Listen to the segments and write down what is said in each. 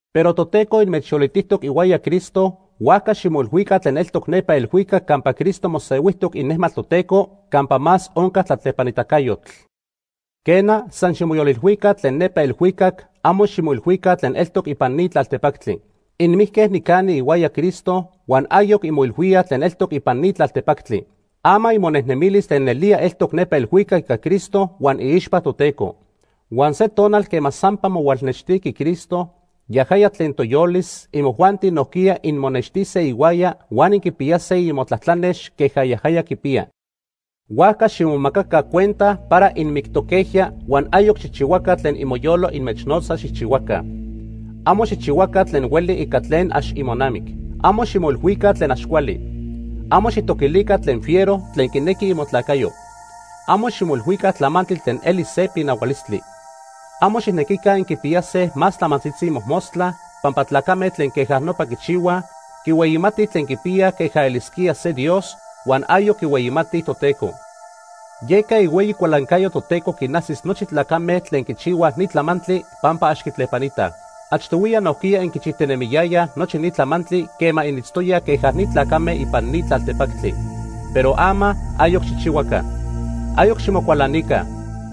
Pero Toteco inmechyolitijtoc ihuaya Cristo, huajca ximoilhuica tlen eltoc nepa elhuicac campa Cristo mosehuijtoc inejmatl Toteco campa más onca tlatlepanitacayotl. Quena, san ximoyolilhuica tlen nepa elhuicac, amo ximoilhuica tlen eltoc ipan ni tlaltepactli. Inmijque nicani ihuaya Cristo huan ayoc inmoilhuíaj tlen eltoc ipan ni tlaltepactli. Ama imonejnemilis tlen nelía eltoc nepa elhuicac ica Cristo huan iixpa Toteco. Huan se tonal quema sampa mohualnextiqui Cristo, yajaya tlen toyolis, imojuanti nojquiya inmonextise ihuaya huan inquipiyase imotlatlanex queja yajaya quipiya. Huajca ximomacaca cuenta para inmictoquejya huan ayoc xijchihuaca tlen imoyolo inmechnotza xijchihuaca. Amo xijchihuaca tlen hueli ica tlen ax imonamic. Amo ximoilhuica tlen ax cuali. Amo xijtoquilica tlen fiero tlen quinequi imotlacayo. Amo ximoilhuica tlamantli tlen eli se pinahualistli. Amo xijnequica inquipiyase más tlamantzitzi mojmostla, pampa tlacame tlen queja nopa quichihuaj, quihueyimatij tlen quipiyaj queja elisquía se dios huan ayoc quihueyimatij Toteco. Yeca ihueyi cualancayo Toteco quinajsis nochi tlacame tlen quichihuaj ni tlamantli pampa ax quitlepanitaj. Achtohuiya nojquiya inquichijtinemiyayaj nochi ni tlamantli quema initztoyaj queja ni tlacame ipan ni tlaltepactli. Pero ama, ayoc xijchihuaca. Ayoc ximocualanica,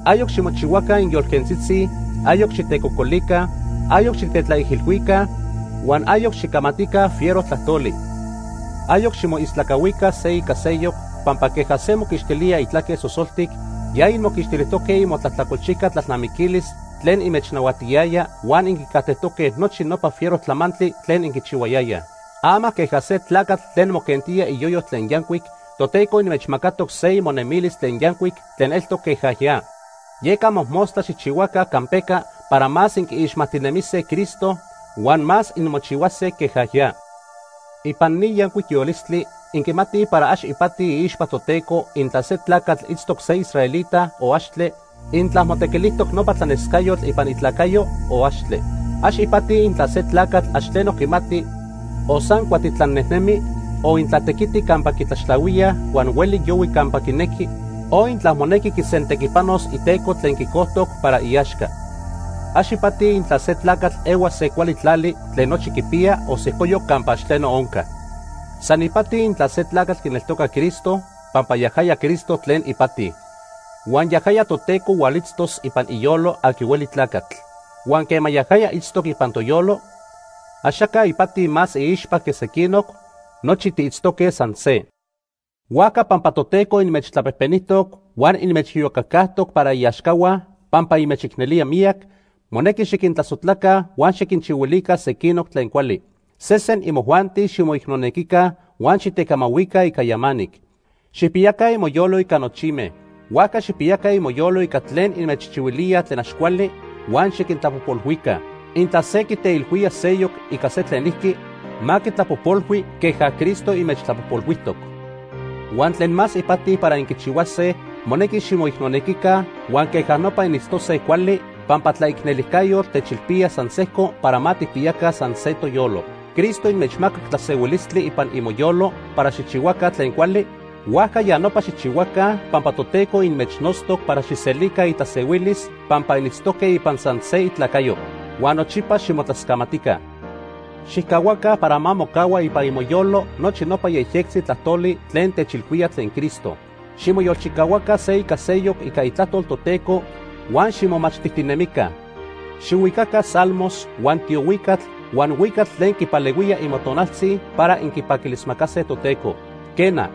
ayoc ximochihuaca inyolquentzitzi, ayoc xitecocolica, ayoc xitetlaijilhuica, huan ayoc xicamatica fiero tlajtoli. Ayoc ximoistlacahuica se ica seyoc pampa queja se moquixtilía itlaque sosoltic, ya inmoquixtilijtoque imotlajtlacolchijca tlalnamiquilis tlen inmechnahuatiyaya huan inquicajtejtoque nochi nopa fiero tlamantli tlen inquichihuayayaj. Ama queja se tlacatl tlen moquentía iyoyo tlen yancuic, Toteco inmechmacatoc se imonemilis tlen yancuic tlen eltoc queja ya. Yeca mojmostla xijchihuaca campeca para más inquiixmajtinemise Cristo huan más inmochihuase queja ya. Ipan ni yancuic yolistli inquimatij para ax ipati iixpa Toteco intla se tlacatl itztoc se israelita o axtle, intla motequilijtoc nopa tlanescayotl ipan itlacayo o axtle. Ax ipati intla se tlacatl ax tleno quimati o san cuatitlan nejnemi, o intla tequiti campa quitlaxtlahuía huan hueli yohui campa quinequi, o intla monequi quisentequipanos iteco tlen quicojtoc para iaxca. Ax ipati intla se tlacatl ehua se cuali tlali tlen nochi quipiya, o sejcoyoc campa ax tleno onca. San ipati intla se tlacatl quineltoca Cristo, pampa yajaya Cristo tlen ipati. Huan yajaya Toteco hualitztos ipan iyolo aqui hueli tlacatl. Huan quema yajaya itztoc ipan toyolo, axaca ipati más iixpa que sequinoc, nochi tiitztoque san se. Huajca pampa Toteco inmechtlapejpenijtoc huan inmechiyocacajtoc para iaxcahua pampa inmechicnelía miyac, monequi xiquintlasojtlaca huan xiquinchihuilica sequinoc tlen cuali. Sesen imojuanti ximoicnonequica huan xitecamahuica ica yamanic. Xijpiyaca imoyolo ica nochime. Huajca xijpiyaca imoyolo ica tlen inmechchihuilíaj tlen ax cuali huan xiquintlapojpolhuica. Intla se quiteilhuía seyoc ica se tlenijqui, ma quitlapojpolhui queja Cristo inmechtlapojpolhuijtoc. Huan tlen más ipati para inquichihuase, monequi ximoicnelica huan queja nopa initztose cuali, pampa tlaicnelijcayotl techilpía san sejco para ma tijpiyaca sanse toyolo. Cristo inmechmacac tlasehuilistli ipan imoyolo para xijchihuaca tlen cuali, huajca ya nopa xijchihuaca, pampa Toteco inmechnotztoc para xijselica itlasehuilis pampa initztoque ipan san se itlacayo. Huan nochipa ximotlascamatica. Xijcahuaca para ma mocahua ipan imoyolo nochi nopa yejyectzi tlajtoli tlen techilhuía tlen Cristo. Ximoyolchicahuaca se ica seyoc ica Itlajtol Toteco huan ximomachtijtinemica. Xihuicaca salmos, huan tiohuicatl, huan huicatl tlen quipalehuía imotonaltzi para inquipaquilismacase Toteco. Quena,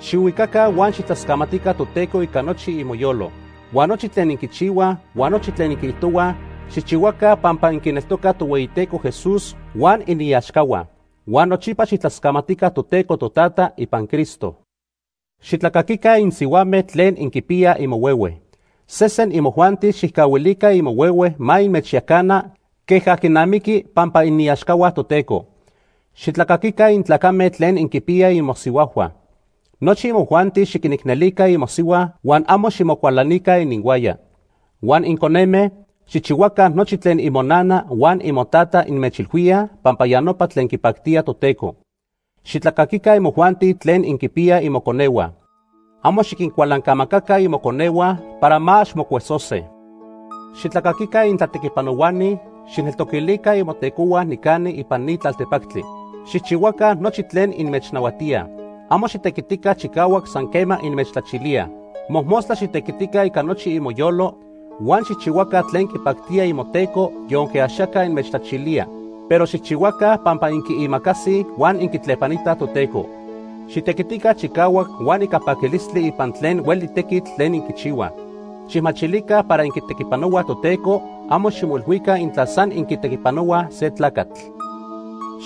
xihuicaca huan xijtlascamatica Toteco ica nochi imoyolo. Huan nochi tlen inquichihuaj huan nochi tlen inquiijtohuaj, xijchihuaca pampa inquineltocaj Tohueyiteco Jesús huan iniaxcahua. Huan nochipa xijtlascamatica Toteco Totata ipan Cristo. Xitlacaquica insihuame tlen inquipiyaj imohuehue. Sesen imojuanti xijcahuilica imohuehue ma inmechyacana queja quinamiqui pampa iniaxcahua Toteco. Xitlacaquica intlacame tlen inquipiyaj imosihuajhua. Nochi imojuanti xiquinicnelica imosihua huan amo ximocualanica ininhuaya. Huan inconeme, xijchihuaca nochi tlen imonana huan imotata inmechilhuíaj pampa ya nopa tlen quipactía Toteco. Xitlacaquica imojuanti tlen inquinpiyaj imoconehua. Amo xiquincualancamacaca imoconehua para ma ax mocuesose. Xitlacaquica intlatequipanohuani xijneltoquilica imotecohua nicani ipan ni tlaltepactli. Xijchihuaca nochi tlen inmechnahuatíaj. Amo xitequitica chicahuac san quema inmechtlachilíaj. Mojmostla xitequitica ica nochi imoyolo huan xijchihuaca tlen quipactía imoteco yonque axaca inmechtlachilía, pero xijchihuaca pampa inquiimacasij huan inquitlepanitaj Toteco. Xitequitica chicahuac huan ica paquilistli ipan tlen hueli tequitl tlen inquichihuaj. Xijmachilica para inquitequipanohuaj Toteco, amo ximoilhuica intla san inquitequipanohuaj se tlacatl.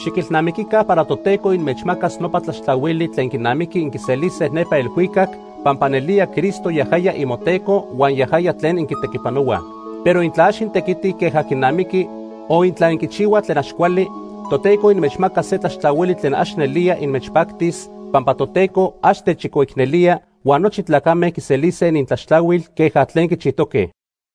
Xiquilnamiquica para Toteco inmechmacas nopa tlaxtlahuili tlen quinamiqui inquiselise nepa elhuicac, pampa nelía Cristo yajaya imoTeco huan yajaya tlen inquitequipanohuaj. Pero intla ax intequitij queja quinamiqui o intla inquichihuaj tlen ax cuali, Toteco inmechmacas se tlaxtlahuili tlen ax nelía inmechpactis, pampa Toteco ax techchicoicnelía huan nochi tlacame quiselise inintlaxtlahuil queja tlen quichijtoque.